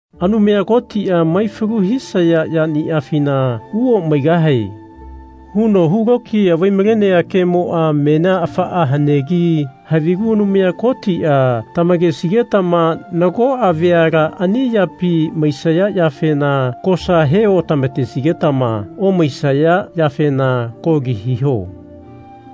Anumaya Kotia Maifalu hisaya yaniafina uomaigahae. huno hu lokiya vai-malenea kemoa menia afaa hanegi havigu Anumaya Kotia tamakesigetama nagoa veala ani yapi maisaya yafena kosa he otamatesigetama omaisaya yafena koli hiho.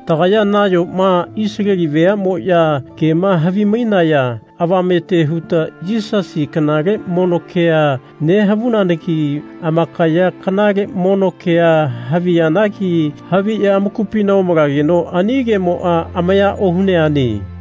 Tagaya nayoma Isaleli veamoya kema havimainaya avamete huta Yisasi kanale mono kea nehavunanagi amakaya kanale mono kea haviyanagi haviya amakupina omalageno ani kemoa amaya ohuneane.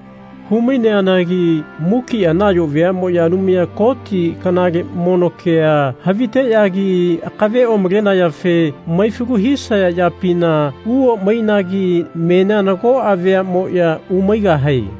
Hu-maineanagi mukia nayo veamoya Anumaya Koti kanale mono kea haviteyagi akave omalenayafe maifalu hisaya yapina uomainagi menia nagoa veamoya umaigahae.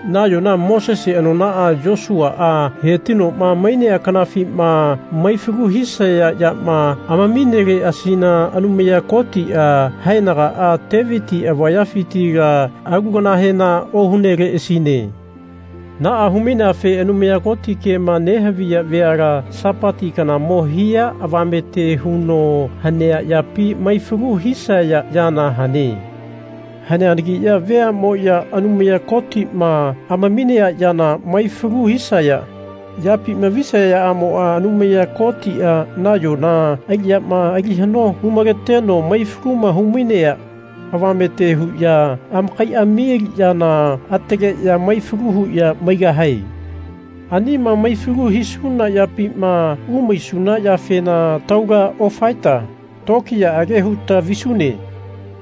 Nayona Mosese anonaa Yosuaa hetinoma mainea kanafima maifalu hisaya yama amamineleasina Anumaya Kotia haenagaa Teviti avayafitila alu kanahena ohuneleasine. Naa hu-maineafe Anumaya Koti kema nehaviya veala Sapati kanamo hia avamete huno hanea yapi maifalu hisaya yana hane. Haneanagiya veamoya Anumaya Kotima amaminea yana maifalu hisaya yapima visayaamoa Anumaya Kotia nayona aliyama ali hano hu-maleteno maifalu humainea avamete huya amakaiami aliyana ataleya maifalu huya maigahae. Anima maifalu hisuna yapima umaisuna yafena taula ofaeta tokiyaage huta visune.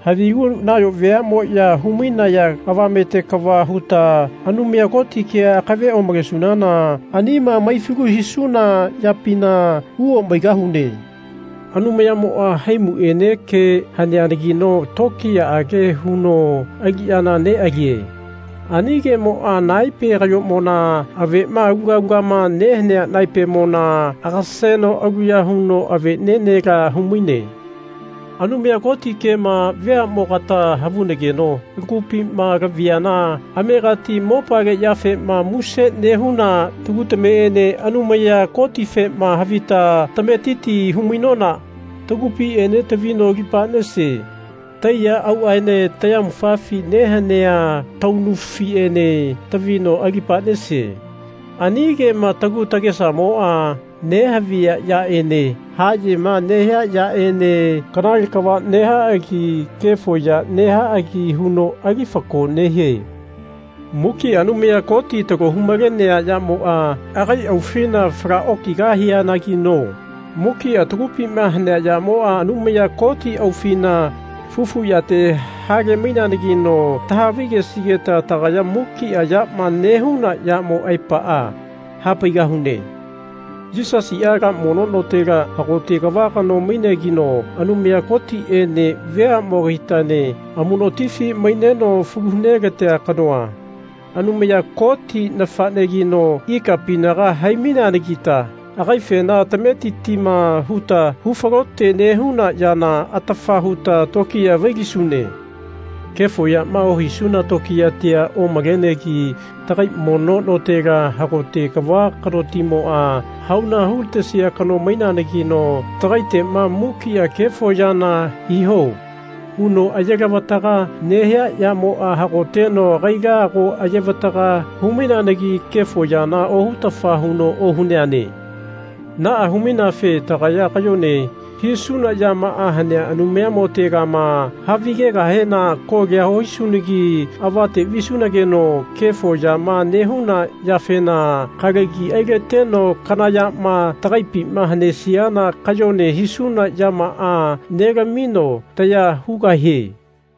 Havigu nayo veamoya hu-mainaya avamete kava huta Anumaya Koti kea akave omalesunana anima maifalu hisuna yapina uomaigahune. Anumayamoa haimuene ke haneanagino tokiyaage huno aliyana nealie. Ani kemoa naepe kayomona avema aluga alugama nehanea naepemona agaseno aluya huno avenenela humaine. Anumaya Koti kema veamogata havunageno lagupima laviana amegati mopale yafema muse nehuna tagu tameene Anumaya Kotifema havita tametiti hu-mainona tagupiene tavino alipanese. Taiya auaene tayamufafi nehanea taunufiene tavino alipanese. Ani kema tagu tagesamoa nehavia yaene hayema nehia yaene kanale kava nehaagi kefo ya nehaagi huno ali fako nehie. Mukia Anumaya Koti talo hu-malenea yamoa agai aufina fala okigahianagino mukia tagupima hanea yamoa Anumaya Koti aufina fufu yate hale-maineanagino tahavi-gesigeta tagaya mukia yama nehuna yamo aepaa hapaigahune. Yisasia ala mono notela hagote kava kanogino, Anumaya Kotiene veamogatiene amunotifi maineno falu hu nelatea kanoa, Anumaya Koti nafanegino ikapinaga hai-maineanagita agaifena tametitima huta hu falote nehuna yana atafa huta tokiya vailisune. Kefo yama ohisuna tokiyatia omalenegi tagai mono notela hagote kava kanotimoa hauna hulatesia kano maineanagino tagaitema mukia Kefo yana hiho. huno aye lavataga nehia yamoa hagoteno agaila ago ayevataga hu-maineanagi kefo yana ohutafa huno ohuneane. Naa hu-maineafe tagaya kayone hisuna yamaa hanea Anumayamotegama havigegahena kolia ohisunagi avate visunageno kefo yama nehuna yafena kalagi ailateno kana yama tagaipima hanesiana kayone hisuna yamaa nelamino taya hugahie.